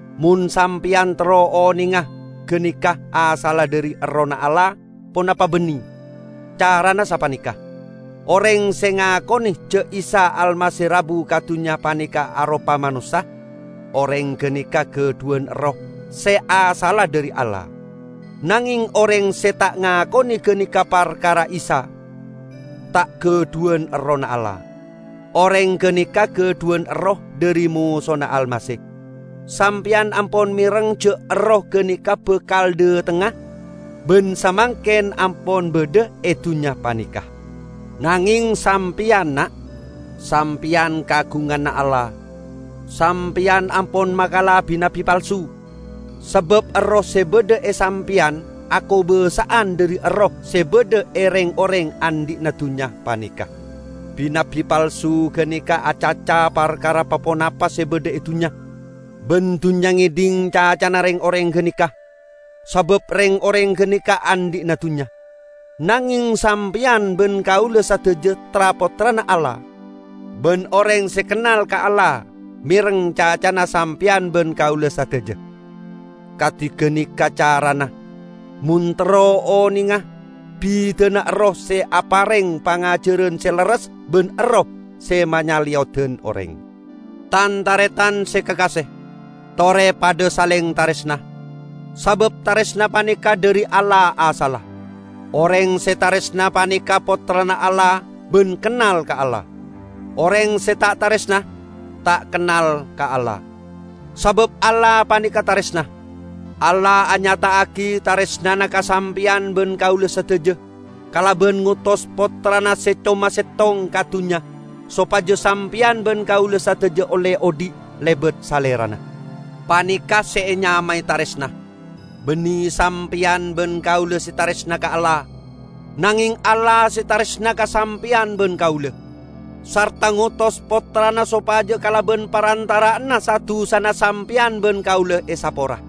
Mon sampeyan terro onenga ganeka asalla dhari Errohna Allah ponapa banne, carana sapaneka: Oreng se ngakone ja' Isa Almasih rabu ka dunnya paneka aropa manossa, oreng ganeka gadhuwan Erroh se asalla dhari Allah. Nangeng oreng se ta' ngakone ganeka parkara Isa, ta' gadhuwan Errohna Allah. Oreng ganeka gadhuwan erroh dhari Mosona Almasih. Sampeyan ampon mereng ja' erroh ganeka bakal dhatengnga, ban samangken ampon badha e dunnya paneka. Nangeng sampeyan, na', sampeyan kaagunganna Allah. Sampeyan ampon makala bi-nabbi palsu, sabab Erroh se badha e sampeyan akobasa'an dhari erroh se badha e reng-oreng andhi'na dunnya paneka. Bi-nabbi palsu ganeka acaca parkara pa-ponapa se badha e dunnya, ban dunnya ngedhing cacana reng-oreng ganeka, sabab reng-oreng ganeka andhi'na dunnya. Nangeng sampeyan ban kaula sadaja tra-pottrana Allah; ban oreng se kennal ka Allah mereng cacana sampeyan ban kaula sadaja. Kadi ganeka carana mon terro onenga bidana Erroh se apareng pangajaran se lerres ban erroh se manyaleyodan oreng. Tan-taretan se kakase! Tore padha saleng taresna, sabab taresna paneka dhari Allah asalla. Oreng se taresna paneka pottrana Allah ban kennal ka Allah. Oreng se ta' taresna, ta' kennal ka Allah; sabab Allah paneka taresna. Allah anyata'agi taresnana ka sampeyan ban kaula sadaja kalaban ngotos Pottrana se coma settong ka dunnya sopaja sampeyan ban kaula sadaja olle odhi' lebat Salerana. Paneka' se enyamae taresna: Banne sampeyan ban kaula se taresna ka Allah, nangeng Allah se taresna ka sampeyan ban kaula, sarta ngotos Pottrana sopaja kalaban parantara'anna sa-dusana sampeyan ban kaula esapora.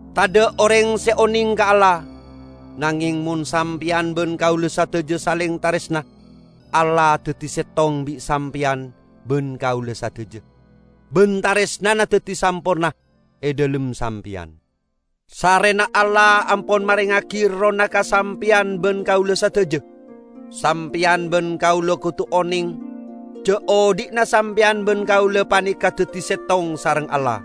Tadha' oreng se oneng ka Allah, nangeng mon sampeyan ban kaula sadaja saleng taresna, Allah daddi settong bi' sampeyan ban kaula sadaja, ban taresnana daddi samporna e dhalem sampeyan. Sarrena Allah ampon marengngagi Errohna ka sampeyan ban kaula sadaja, sampeyan ban kaula kodu oneng ja' odhi'na sampeyan ban kaula paneka daddi settong sareng Allah,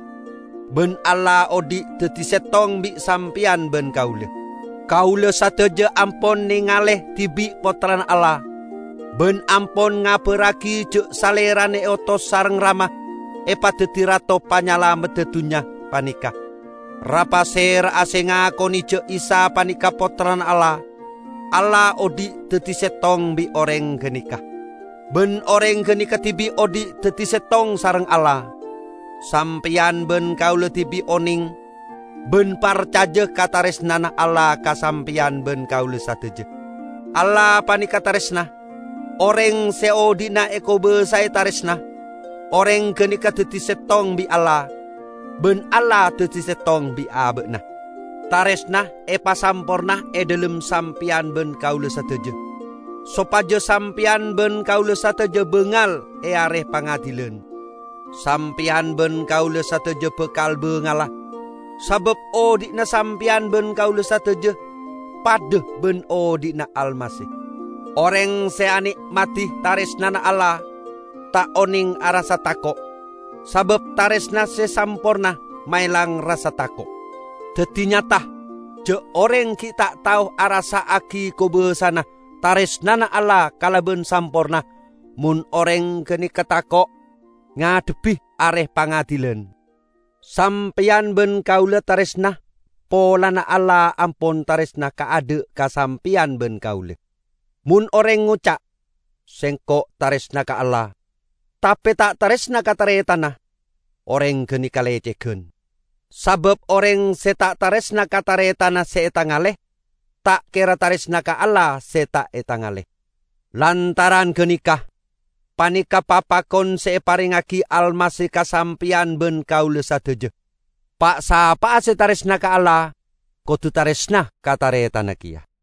ban Allah odhi' daddi settong bi' sampeyan ban kaula. Kaula sadaja ampon nengale dibi' Pottrana Allah, ban ampon ngabarragi ja' Salerana eotos sareng Rama epadaddi Rato Panyalamedda dunnya paneka. Ra'-pasera'a se ngakone ja' Isa paneka Pottrana Allah, Allah odhi' daddi settong bi' oreng ganeka, ban oreng ganeka dibi' odhi' daddi settong sareng Allah. Sampeyan ban kaula dibi' oneng ban parcaja ka taresnana Allah ka sampeyan ban kaula sadaja. Allah paneka taresna. Oreng se odhi'na ekobasae taresna, oreng ganeka daddi settong bi' Allah, ban Allah daddi settong bi' aba'na. Taresna epasamporna e dhalem sampeyan ban kaula sadaja, sopaja sampeyan ban kaula sadaja bangal e Are Pangadilan. Sampeyan ban kaula sadaja bakal bangala, sabab odhi'na sampeyan ban kaula sadaja padha ban odhi'na Almasih. Oreng se ane'madi taresnana Allah, ta' oneng arassa tako'; sabab taresna se samporna maelang rassa tako'. Daddi nyata ja' oreng gi' ta' tao arassa'agi kobassana taresnana Allah kalaban samporna mon oreng ganeka tako' ngadhebbi Are Pangadilan. Sampeyan ban kaula taresna polana Allah ampon taresna kaadha' ka sampeyan ban kaula. Mon oreng ngoca', "Sengko' taresna ka Allah," tape ta' taresna ka taretanna, oreng ganeka lecegan. Sabab oreng se ta' taresna ka taretanna se etangale, ta' kera taresna ka Allah se ta' etangale. Lantaran ganeka, paneka' papakon se eparengngagi Almasih ka sampeyan ban kaula sadaja: Pa'-sapa'a se taresna ka Allah kodu taresna ka taretanna keya.